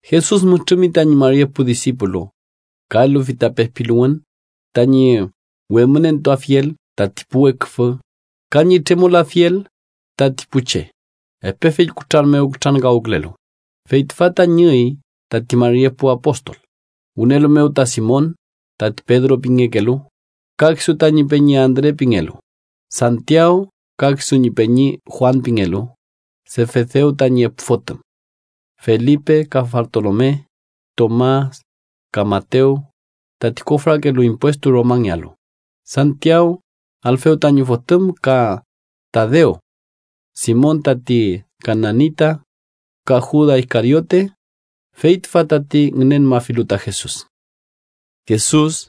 Jesus mütrümi tañi mari epu disipulu, ka elufi ta pepiluwün tañi wemünentuafiel tati pu weküfü ka ñi tremolafiel tati pu che epe fill kutran mew kutrankawkülelu. Fey tüfa tañi üy tati mari epu apostol: wünelu mew ta Simon, tati Pedro pingekelu, ka kisu tañi peñi Andre pingelu; Santiaw ka kisu ñi peñi Juan pingelu, Sefedew tañi epu fotüm; Felipe ka Bartolome; Tomas ka Matew, tati kofrakelu impuestu Romangealu; Santiaw, Alfew tañi fotüm, ka Tadew, Simon tati kananita, ka Juda Iskariote, fey tüfa tati ngünenmafilu ta Jesus. Jesus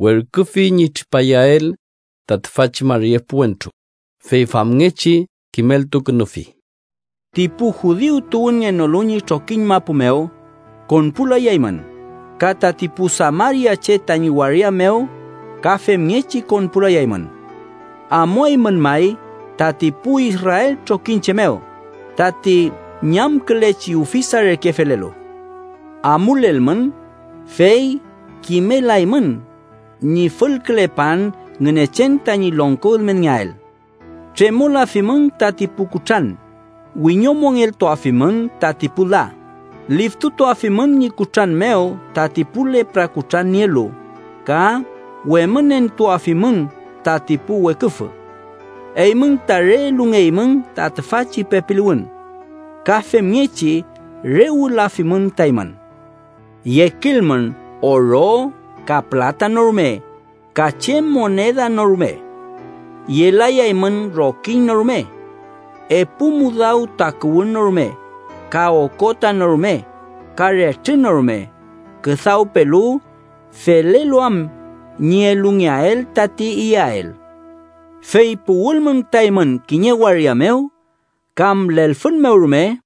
werküfi ñi tripayael ta tüfachi mari epu wentru, fey famngechi kimeltukünufi: “Ti pu judiu tuwünngenolu ñi trokiñ mapu mew konpulayaymün, ka tati pu samariache tañi waria mew ka femngechi konpulayaymün. Amuaymün may tati pu Israel trokiñche mew, tati ñamkülechi ufisa reke felelu. Amulelmün fey kimelaymün ñi fülkülepan Ngünechen tañi longko ülmenngeael. Tremolafimün tati pu kutran, wiñomongeltuafimün tati pu la, liftutuafimün ñi kutran mew tati pu lepra kutran nielu ka wemünentuafimün tati pu weküfü. Eymün ta re elungeymün ta tüfachi pepiluwün. Ka femngechi re wülafimün ta eymün. Yekilmün oro ka pülata no rume ka chem moneda no rume. Yelayaymün rokiñ no rume, epu mudaw takuwün no rume, ka okota no rume ka retrü no rume, küdawpelu felelu am ñi elungeael tati iyael. “Fey puwülmün ta eymün kiñe waria mew kam lelfün mew rume,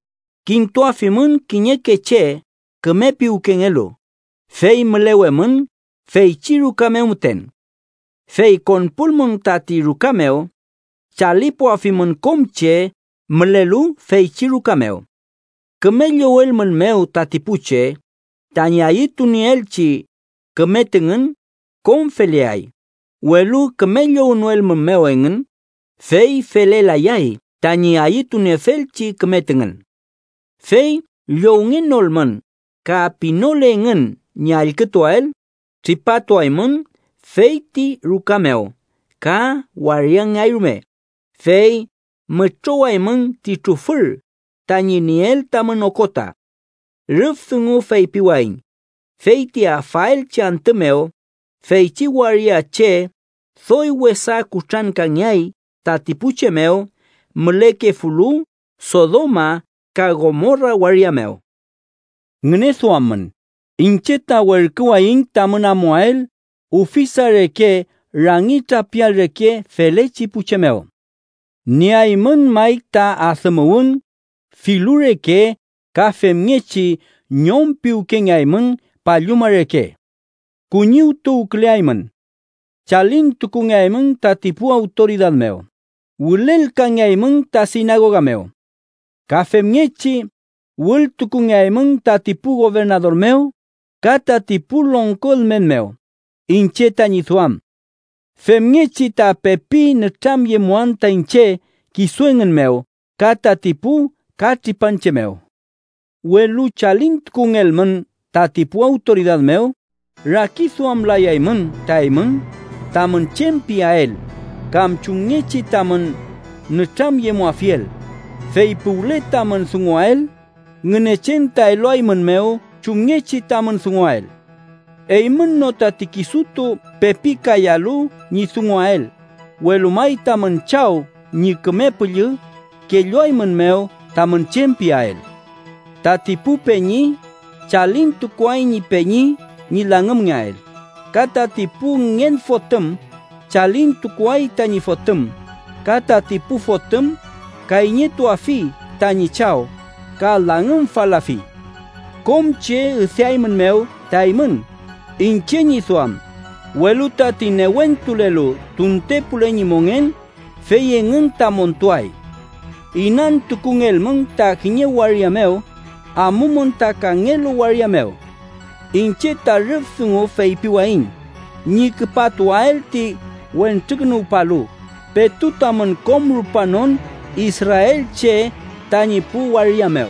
kintuafimün kiñeke che küme piwkengelu, fey mülewemün feychi ruka mew müten. Fey konpulmün tati ruka mew, chalipuafimün kom che mülelu feychi ruka mew. Küme llowelmünmew tati pu che, tañi ayütunieelchi küme tüngün kom feleay, welu küme llownoelmünmew engün, fey felelayay tañi ayütuniefelchi küme tüngün. Fey llowngenolmün ka pinole engün ñi allkütuael, tripatuaymün feyti ruka mew ka wariangeay rume, fey mütrowaymün ti trufür tañi nieel tamün okota. Rüf dungu feypiwayiñ, fey ti afaelchi antü mew feychi waria che doy wesa kutrankangeay tati pu che mew mülekefulu Sodoma ka Gomora waria mew. “¡Ngüneduammün! Iñche ta werküwayiñ tamün amuael ufisa reke rangi trapial reke felechi pu che mew. Nieaymün may ta adümuwün, filu reke, ka femngechi ñom piwkengeaymün palluma reke. “Kuñiwtuwküleaymün. Chalintukungeaymün tati pu awtoridad mew, wülelkangeaymün ta sinagoga mew. Ka femngechi wültukungeaymün tati pu gobernador mew ka tati pu longko ülmen mew iñche tañi duam. Femngechi ta pepi nütramyemuan ta iñche kisu engün mew ka tati pu katripanche mew. Welu chalintukungelmün tati pu awtoridad mew, rakiduamlayaymün ta eymün tamün chem piael, kam chumngechi tamün nütramyemuafiel, fey puwle tamün dunguael, Ngünechen ta eluaeymünmew chumngechi tamün dunguael. Eymün no tati kisutu pepikayalu ñi dunguael, welu may tamün Chaw ñi Küme Püllü kelluaeymünmew tamün chem piael. “Tati pu peñi chalintukuay ñi peñi ñi langümngeael, ka tati pu ngen fotüm chalintukuay tañi fotüm, ka tati pu fotüm kayñetuafi tañi chaw ka langümfalafi. Kom che üdeaeymünmew ta eymün iñche ñi duam, welu tati newentulelu tuntepule ñi mongen, fey engün ta montuay. Inantukungelmün ta kiñe waria mew, amumün ta kangelu waria mew. Iñche ta rüf dungu feypiwayiñ ñi küpatuael ti Wentrukünuwpalu petu tamün kom rupanon israelche tañi pu waria mew.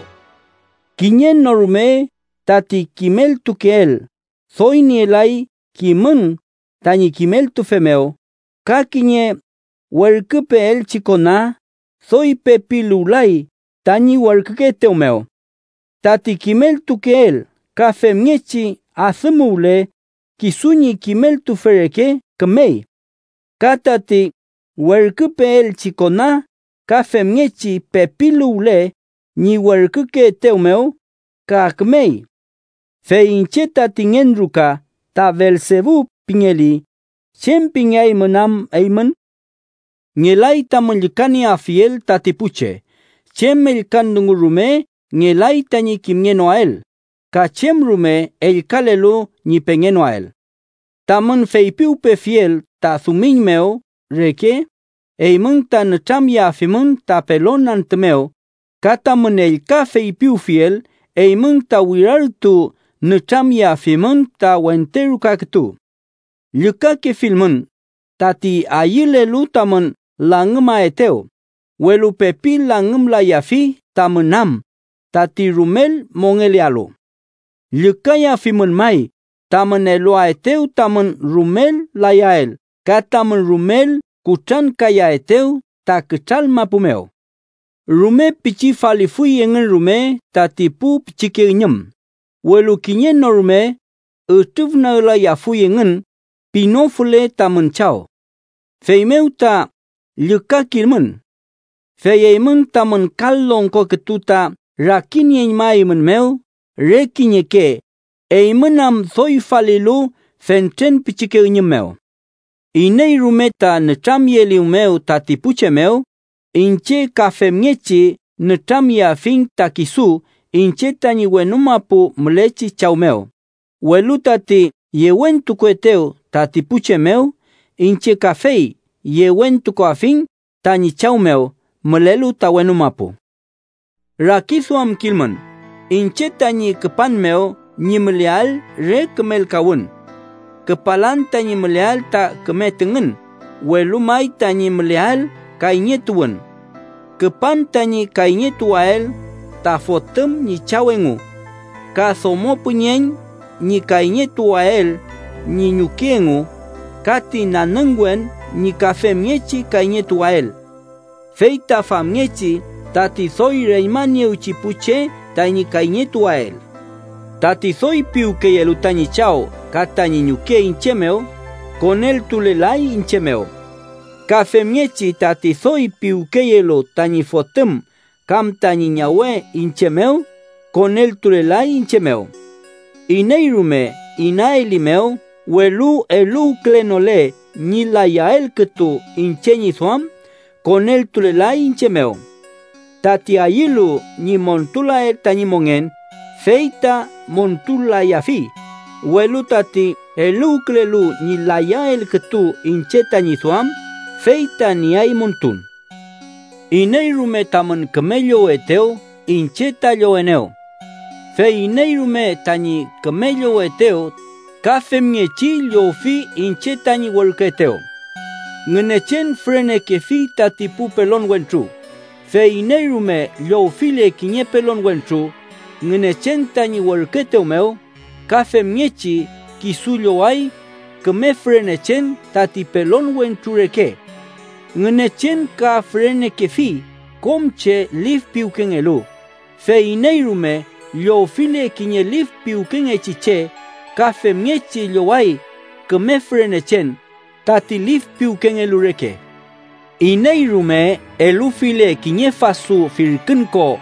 “Kiñe no rume tati kimeltukeel, doy nielay kimün tañi kimeltufe mew ka kiñe werküpeelchi kona doy pepiluwlay tañi werkükeetew mew. Tati kimeltukeel ka femngechi adümuwle kisu ñi kimeltufe reke, kümey. Ka tati werküpeelchi kona ka femngechi pepiluwle ñi werkükeetew mew, ka kümey. Fey iñche tati ngen ruka ta Belsebu pingeli, ¿chem pingeaymün am eymün? “Ngelay tamün llükanieafiel tati pu che. Chem ellkan dungu rume ngelay tañi kimngenoael, ka chem rume ellkalelu ñi pengenoael. Tamün feypiwpefiel ta dumiñ mew reke, eymün ta nütramyeafimün ta pelon antü mew ka tamün ellka feypiwfiel eymün, ta wirartu nütramyeafimün ta wente ruka kütu. Llükakefilmün tati ayülelu tamün langümaetew, welu pepi langümlayafi tamün am tati rumel mongelealu. Llükayafimün may tamün eluaetew tamün rumel layael ka tamün rumel kutrankayaetew ta kütral mapu mew. Rume pichi falifuy engün rume tati pu pichike üñüm, welu kiñe no rume ütrüfnaglayafuy engün pinofule tamün Chaw. Feymew ta llükakilmün. Fey eymün tamün kal longko kütu ta rakinieñmaeymünmew re kiñeke, eymün am doy falilu fentren pichike üñüm mew. “Iney rume ta nütramyeelimew tati pu che mew, iñche ka femngechi nütramyeafiñ ta kisu iñche tañi wenu mapu mülechi Chaw mew, welu tati yewentukuetew tati pu che mew, iñche kafey yewentukuafiñ tañi Chaw mew mülelu ta wenu mapu. “Rakiduamkilmün iñche tañi küpan mew ñi müleael re kümelkawün. Küpalan tañi müleael ta küme tüngün, welu may tañi müleael kayñetuwün. Küpan tañi ‘kayñetuwael ta fotüm ñi chaw engu, ka domo püñeñ ñi kayñetuwael ñi ñuke engu ka ti nanüngwen ñi ka femngechi kayñetuwael. Fey ta famngechi tati doy reñmaniewchi pu che tañi kayñetuwael.’ “Tati doy piwkeyelu tañi chaw ka tañi ñuke iñche mew, koneltulelay iñche mew. Ka femngechi tati doy piwkeyelu tañi fotüm kam tañi ñawe iñche mew, koneltulelay iñche mew. Iney rume inaelimew, welu eluwkülenole ñi layael kütu iñche ñi duam, koneltulelay iñche mew. Tati ayülu ñi montulael tañi mongen, fey ta montul-layafi, welu tati eluwkülelu ñi layael kütu iñche tañi duam, fey ta nieay montun. “Iney rume tamün küme llowetew, iñche ta llowenew. Fey iney rume tañi küme llowetew, ka femngechi llowfi iñche tañi werküetew. Ngünechen fürenekefi tati pu pelon wentru, fey iney rume llowfile kiñe pelon wentru Ngünechen tañi werküetew mew, ka femngechi kisu lloway küme fürenechen tati pelon wentru reke. Ngünechen ka fürenekefi kom che lif piwkengelu, fey iney rume llowfile kiñe lif piwkengechi che, ka femngechi lloway küme fürenechen tati lif piwkengelu reke. Iney rume elufile kiñe fasu firkün ko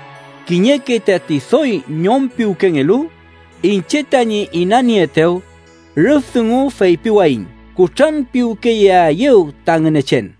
kiñeke tati doy ñom piwkengelu iñche tañi inanieetew, rüf dungu feypiwayiñ kutranpiwkeyeaeyew ta Ngünechen.”